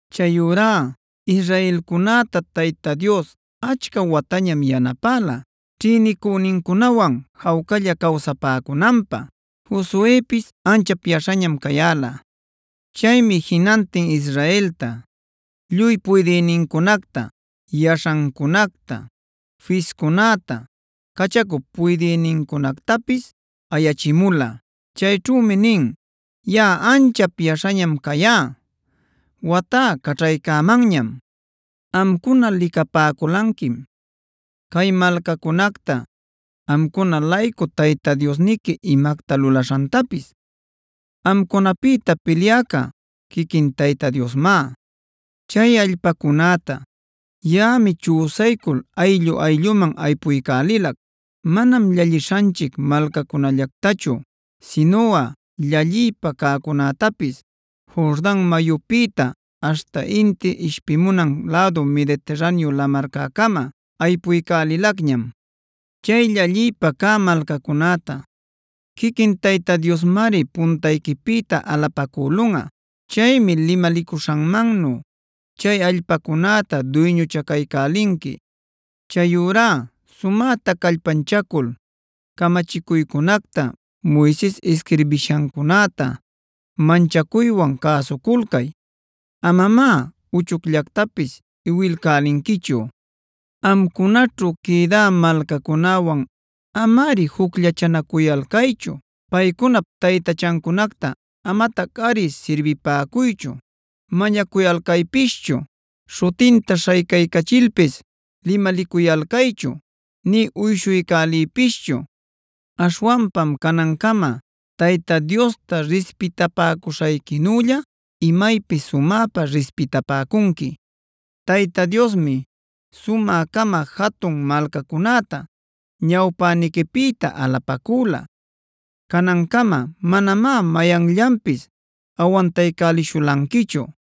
Chayurá israelcunäta Tayta Dios achca watañam yanapäla ćhïnicünincunawan jawcalla cawsapäcunanpä. Josuepis anchap yaśhañam cayäla. Chaymi jinantin Israelta, lluy puydïnincunacta, yaśhancunacta, fiscunäta, cachacup puydïnincunactapis ayachimula. Chayćhümi nin: “Yaꞌa anchap yaśhañam cayá; watá caćhaycämanñam. Amcuna licapäculanquim cay malcacunacta amcuna-laycu Tayta Diosniqui imacta lulaśhantapis. Amcunapïta pilyäca quiquin Tayta Diosmá. Chay allpacunäta yaꞌami chüsaycul ayllu-aylluman aypuycälilac. Manam llallishanchic malcacunällactachu sinuꞌa llalliypä cäcunätapis Jordan mayupïta aśhta inti ishpimunan lädu Mediterraneo lamarcäcama aypuycälilacñam. Chay llalliypä cä malcacunäta quiquin Tayta Diosmari puntayquipïta alapacülunꞌa. Chaymi limalicuśhanmannu chay allpacunäta duyñuchacaycälinqui. “Chayurá sumäta callpanchacul camachicuycunacta Moises isquirbishancunäta manchacuywan cäsuculcay; amamá uchucllatapis iwilcälinquichu. Amcunaćhu quïdä malcacunäwan amari jucllachanacuyalcaychu. Paycunap taytachancunacta amatacꞌari sirbipäcuychu, mañacuyalcaypischu, śhutinta śhaycaycachilpis limalicuyalcaychu, nï uyshuycäliypischu. Aśhwanpam canancama Tayta Diosta rispitapäcuśhayquinülla imaypis sumäpa rispitapäcunqui. “Tayta Diosmi sumä-cama jatun malcacunäta ñawpäniquipïta alapacüla. Canancama manamá mayanllanpis awantaycälishulanquichu.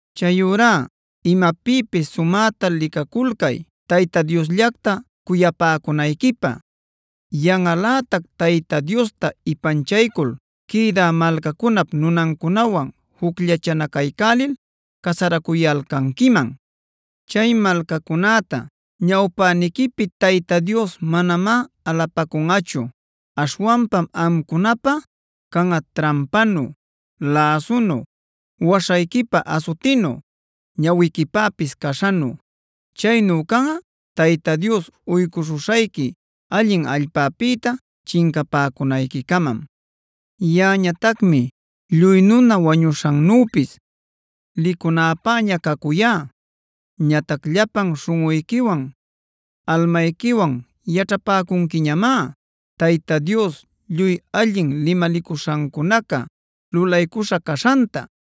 Chayurá imapïpis sumäta licaculcay Tayta Diosllacta cuyapäcunayquipä. Yanꞌalätac Tayta Diosta ipanchaycul quïdä malcacunap nunancunawan jucllachanacaycälil casaracuyalcanquiman. Chay malcacunäta ñawpäniquipi Tayta Dios manamá alapacunꞌachu. Aśhwanpam amcunapä canꞌa trampanu, läsunu, waśhayquipä asutinu, ñawiquipäpis caśhanu. Chaynu canꞌa Tayta Dios uycuśhuśhayqui allin allpapïta chincapäcunayquicamam. “Yaꞌañatacmi lluy nuna wañuśhannüpis licunäpäña cacuyá. Ñatac llapan śhunꞌuyquiwan, almayquiwan yaćhapäcunquiñamá Tayta Dios lluy allin limalicuśhancunaca lulaycuśha caśhanta.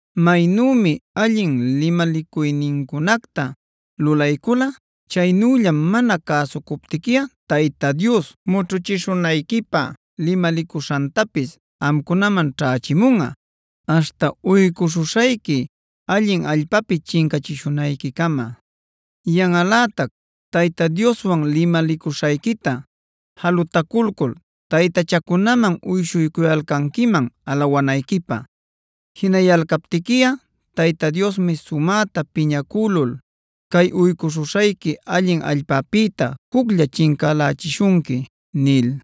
Maynümi allin limalicuynincunacta lulaycula, chaynüllam mana cäsucuptiquiꞌa Tayta Dios mućhuchishunayquipä limalicuśhantapis amcunaman ćhächimunꞌa aśhta uycuśhuśhayqui allin allpapi chincachishunayquicama. Yanꞌalätac Tayta Dioswan limalicuśhayquita jalutaculcul taytachacunaman uyshuycuyalcanquiman alawanayquipä. Jinayalcaptiquiꞌa Tayta Diosmi sumäta piñacülul cay uycuśhuśhayqui allin allpapïta juclla chincälächishunqui” nil.